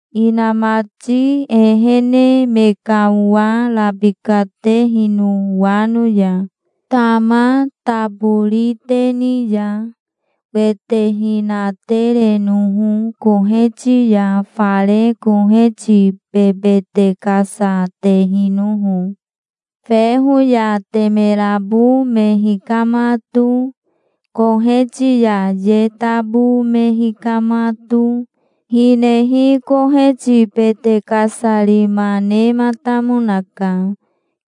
inamati ehene me ka owa rabikatehino wano ya, tama taboriteni ya, wete hinaterenoho koheti ya fare koheti bebete kasa tehinoho. Feho ya temerabo me hikamato, koheti ya ye tabo me hikamato, hinehi koheti bete kasarima nematamonaka,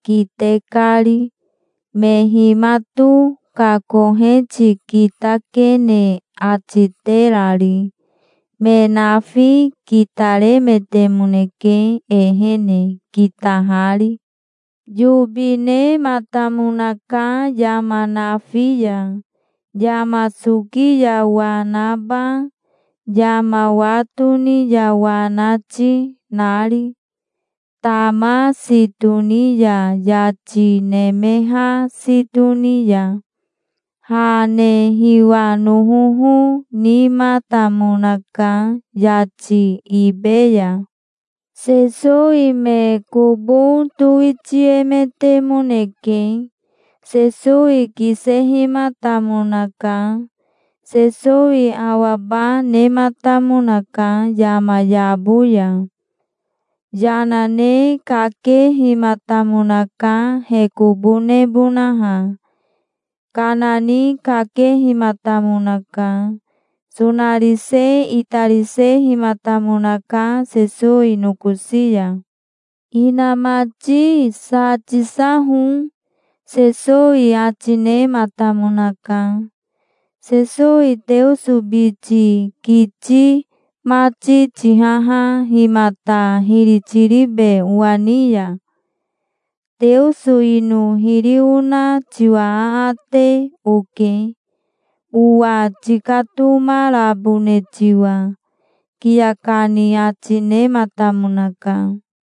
kite kari, me himato ka koheti kitakene ati terari. Me nafi kitaremetemoneke ehene, kitahari. Yobi nematamonaka yama nafi ya, yama soki ya wa naba, yama wa toni ya wa nati, nari, tama si toni ya yati nemeha si toni ya. Ha ne hiwa nohoho nimatamonaka, yati ibe ya. Sesowi me kobo towitiemetemoneke. Sesowi kisehimatamonaka. Sesowi awaba nematamonaka yama yabo ya. Yana ne kakehimatamonaka he kobo nebonaha. Kana ni kakehimatamonaka. Sonarise itarisehimatamonaka Sesowi nokosi ya. "Inamati, sa tisaho", Sesowi ati nematamonaka. "Sesowi Teoso biti kiti mati tihaha himata hiri tiribe owa ni ya? Teoso ino hiri ona tiwa aate oke, owa tikatomarabone tiwa", kiya kani ati nematamonaka.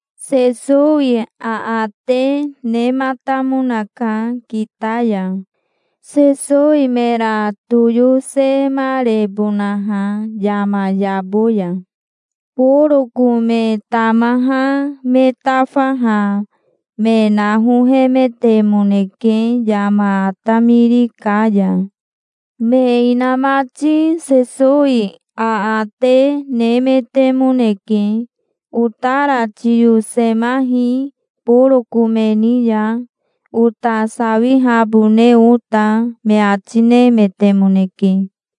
Sesowi aate nematamonaka kita ya, Sesowi mera toyosemarebonaha yama yabo ya. Boroko me tamaha me tafaha me nahohemetemoneke yama atamiri ka ya. Me inamati Sesowi aate nemetemoneke. "Otara tiyosemahi boroko me ni ya, ota sawihabone ota", me ati nemetemoneke.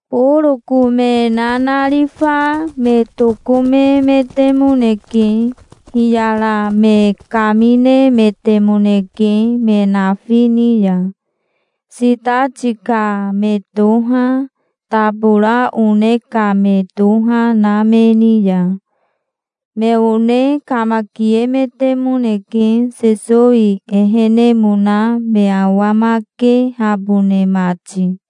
Boroko me nanarifa me tokomemetemoneke. Hiyara me kaminemetemoneke me nafi ni ya, sitati ka me toha, tabora one ka me toha na me ni ya. Me one kamakiemetemoneke Sesowi ehenemona me awamakehabone mati.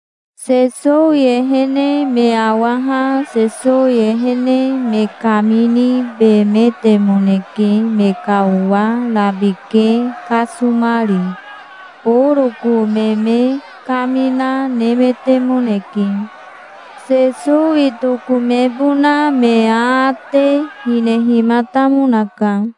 Sesowi ehene me awaha Sesowi ehene me kaminibemetemoneke me ka owa rabike kasomari. Boroko me me kamina nemetemoneke. Sesowi tokomebona me aate hinehimatamonaka.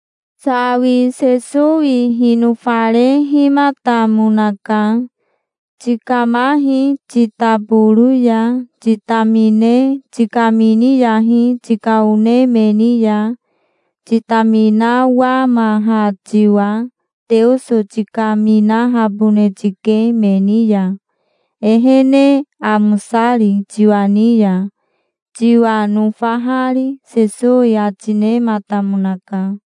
Sawi Sesowi hinofarehimatamonaka. "Tikamahi titaboro ya. Titamine tikaminiyahi tika one me ni ya titaminawamaha tiwa. Teoso tikaminahabone tike me ni ya, ehene amosari, tiwa ni ya, tiwa nofahari", Sesowi ati nematamonaka.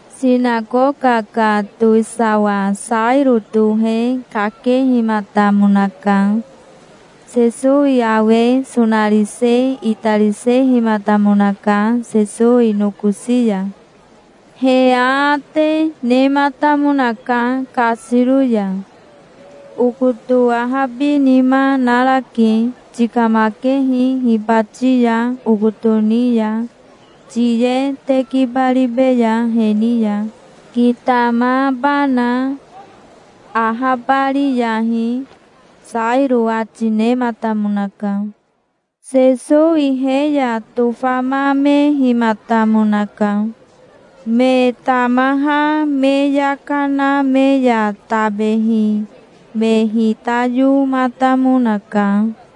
Sinakoka ka towisawa Sairo tohe kakehimatamonaka. Sesowi awe sonarise itarisehimatamonaka Sesowi nokosi ya. He aate nematamonaka kasiro ya. "Okoto ahabinima narake. Tikamakehi hibati ya okoto ni ya. Tiye tekibaribeya he ni ya, kitamabana. Ahabariyahi", Sairo ati nematamonaka. Sesowi he ya tofamamehimatamonaka. Me tamaha me yaka na me ya tabehi me hitayomatamonaka.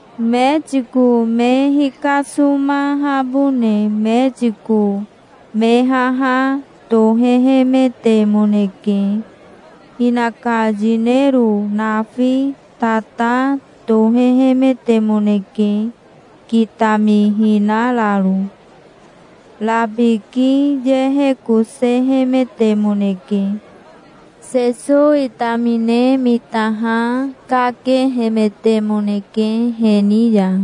Metiko me hikasomahabone metiko me haha tohehemetemoneke. Hinaka yinero nafi tata tohehemetemoneke kitamihinararo. Rabiki yehekosehemetemoneke. Sesowi tamine mitaha kakehemetemoneke he ni ya.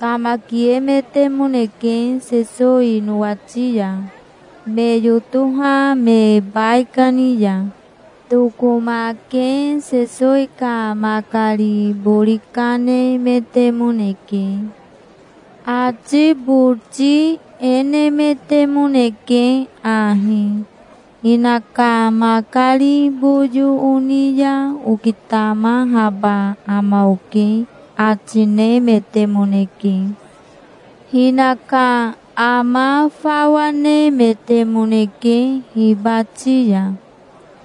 Kamakiemetemoneke Sesowi nowati ya, me yotoha me baikani ya. Tokomake Sesowi ka makari bori kanemetemoneke. Ati boti e nemetemoneke ahi: "Hinaka makari boyo oni ya okitamahaba ama oke", ati nemetemoneke. Hinaka ama fawa nemetemoneke hibati ya.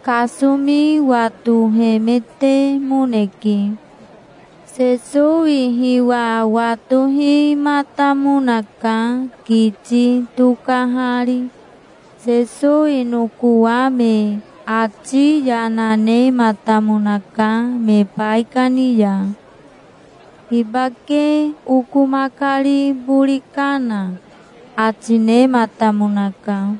Kasomi watohemetemoneke. Sesowi hiwa watohimatamonaka kiti tokahari. Sesowi nokowame ati yana nematamonaka me baikani ya. "Hibake oko makari bori kana?" ati nematamonaka.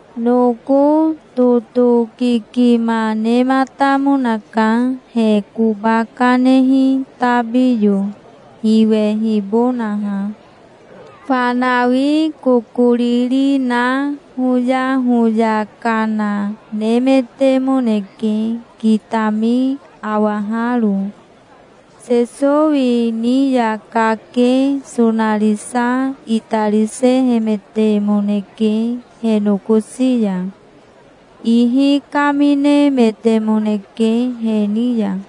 Noko totokikima nematamonaka, he koba kanehi tabiyo hiwehibonaha. Fanawi kokoriri na hoyahoya kana nemetemoneke kitami awaharo. Sesowi ni ya kake sonarisa itarisehemetemoneke he nokosi ya. Ihi kaminemetemoneke he ni ya.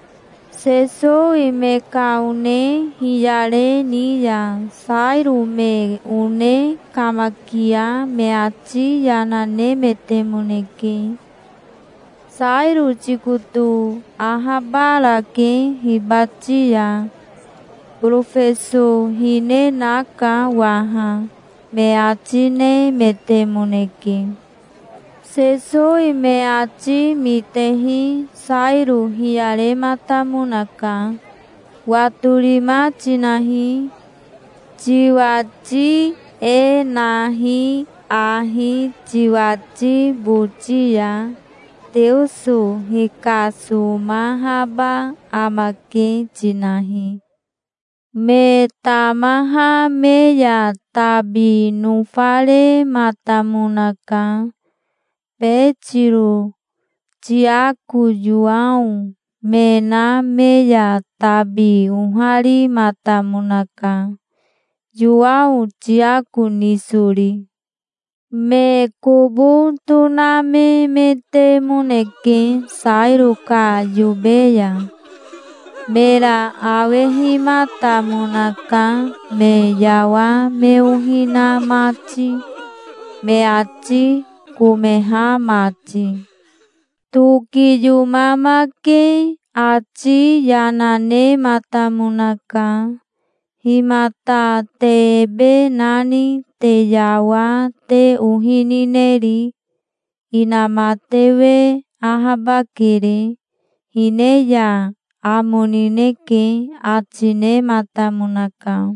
Sesowi me ka one hiyare ni ya Sairo me one kamakia me ati yana nemetemoneke. "Sairo tikoto ahabarake hibati ya. Borofeso hine naka waha", me ati nemetemoneke. Sesowi me ati mitehi Sairo hiyarematamonaka. "Watorima tinahi. Tiwati e nahi ahi tiwati boti ya: 'Teoso hikasomahaba amake', tinahi". Me tamaha me ya tabi nofarematamonaka. Betiro, Tiako, Yowao, me na me ya tabi oharimatamonaka, Yowao Tiako nisori. Me kobo tonamemetemoneke Sairo ka yobe ya. Mera awehimatamonaka, me yawa me ohi na mati, me ati komeha mati. Tokiyomamake ati yana nematamonaka. "Himata te ebe nani te yawa te ohi nineri? Inamatewe ahabakere. Hine ya amo nineke", ati nematamonaka.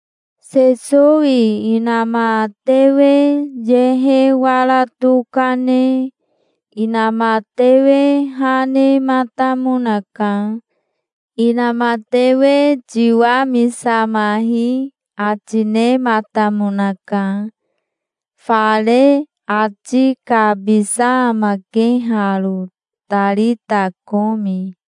Sesowi inamatewe yehe wara tokane inamatewe ha nematamonaka. "Inamatewe tiwamisamahi", ati nematamonaka. Fare ati kabisa amake haro, "Tarita komi".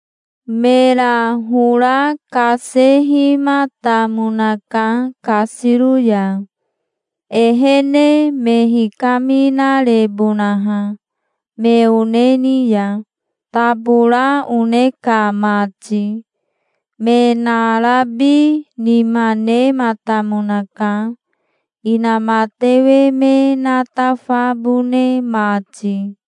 Mera hora kasehimatamonaka kasiro ya, ehene me hikaminarebonaha, me one ni ya, tabora one ka mati. Me narabi nima nematamonaka, inamatewe me natafabone mati.